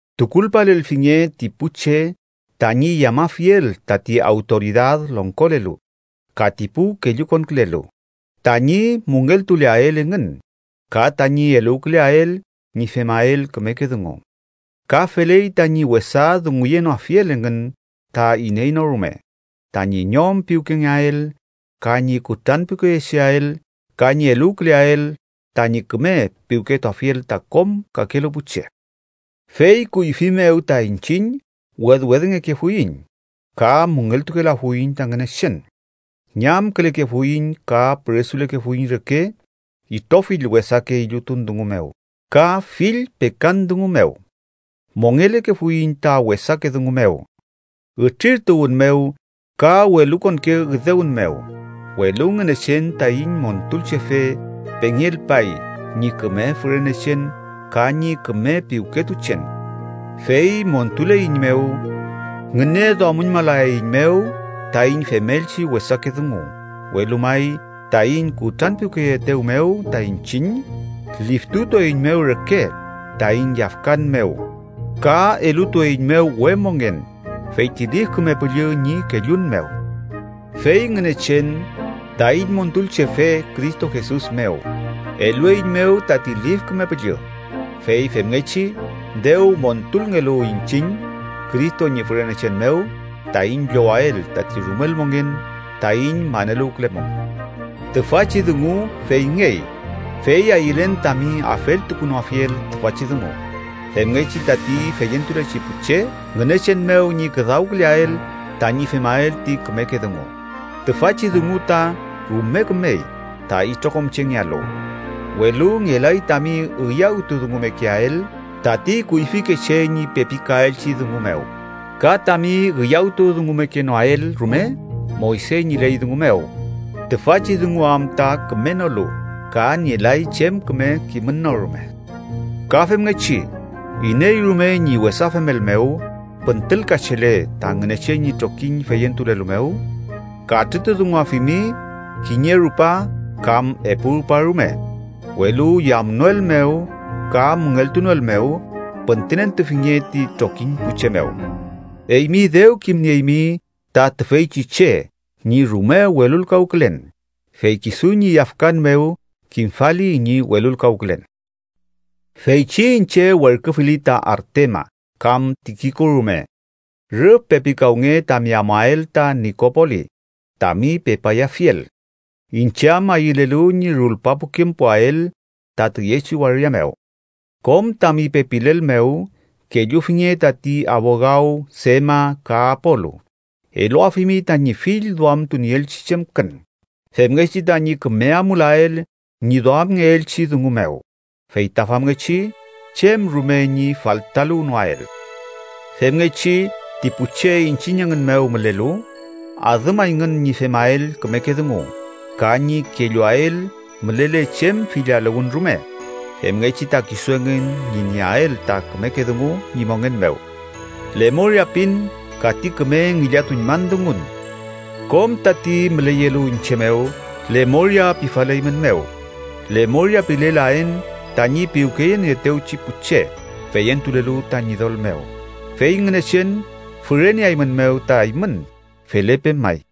Tukulpalelfinge ti pu che tañi yamafiel tati awtoridad longkolelu ka ti pu kellukonkülelu, tañi müngeltuleael engün ka tañi eluwküleael ñi femael kümeke dungu. Ka feley tañi wesa dunguyenoafiel engün ta iney no rume, tañi ñom piwkengeael ka ñi kutranpiwkeyecheael ka ñi eluwküleael tañi küme piwketuafiel ta kom kakelu pu che. Fey kuyfi mew ta iñchiñ wedwedngekefuiñ ka müngeltukelafuiñ ta Ngünechen. Ñamkülekefuiñ ka püresulekefuiñ reke itrofill wesake illutun dungu mew ka fill pekan dungu mew. Mongelekefuiñ ta wesake dungu mew, ütrirtuwün mew, ka welukonke üdewün mew. Welu Ngünechen taiñ Montulchefe pengelpay ñi küme fürenechen ka ñi küme piwketuchen, fey montuleiñmew. Ngüneduamüñmalaeiñmew taiñ femelchi wesake dungu, welu may taiñ kutranpiwkeyeetew mew ta iñchiñ, liftutueiñmew reke taiñ yafkan mew ka elutueiñmew we mongen, fey ti Lif Küme Püllü ñi kellun mew. Fey Ngünechen, taiñ Montulchefe Cristo Jesus mew, elueiñmew tati Lif Küme Püllü fey femngechi, dew montulngelu iñchiñ Cristo ñi fürenechen mew, taiñ llowael tati rumel mongen taiñ maneluwkülemum. Tüfachi dungu feyngey, fey ayülen tami afeltukunoafiel tüfachi dungu, femngechi tati feyentulechi pu che Ngünechen mew ñi küdawküleael tañi femael ti kümeke dungu. Tüfachi dungu ta rume kümey ta itrokom chengealu. Welu ngelay tami üyawtudungumekeael tati kuyfikeche ñi pepikaelchi dungu mew, ka tami üyawtudungumekenoael rume Moyse ñi ley dungu mew. Tüfachi dungu am ta kümenolu ka nielay chem küme kimün no rume. Ka femngechi iney rume ñi wesa femel mew püntülkachele ta Ngünechen ñi trokiñ feyentulelu mew, katrütudunguafimi kiñe rupa kam epu rupa rume, welu yamnoelmew ka müngeltunoelmew, püntünentufinge ti trokiñ pu che mew. Eymi dew kimnieymi ta tüfeychi che ñi rume welulkawkülen, fey kisu ñi yafkan mew kimfali ñi welulkawkülen. Feychi iñche werküfili ta Artemas kam Tikiko rume, rüf pepikawnge tami amuael ta Nikopolis tami pepayafiel, iñche am ayülelu ñi rulpapukempuael ta tüyechi waria mew. Kom tami pepilel mew kellufinge tati abogaw Sema ka Apolu, eluafimi tañi fill duamtunieelchi chemkün femngechi tañi küme amulael ñi duamngeelchi dungu mew, fey ta famngechi chem rume ñi faltaluwnoael. Femngechi ti pu che iñchiñ engün mew mülelu adümayngün ñi femael kümeke dungu ka ñi kelluael mülele chem fillaluwün rume, femngechi ta kisu engün ñi nieael ta kümeke dungu ñi mongen mew. Lemoria pin ka ti küme ngillatuñman dungun. Kom tati müleyelu iñche mew lemoria pifaleymünmew. Lemoria pilelaen tañi piwkeyenieetewchi pu che feyentulelu ta Ñidol mew. Fey Ngünechen füreneaeymünmew ta eymün. Felepe may.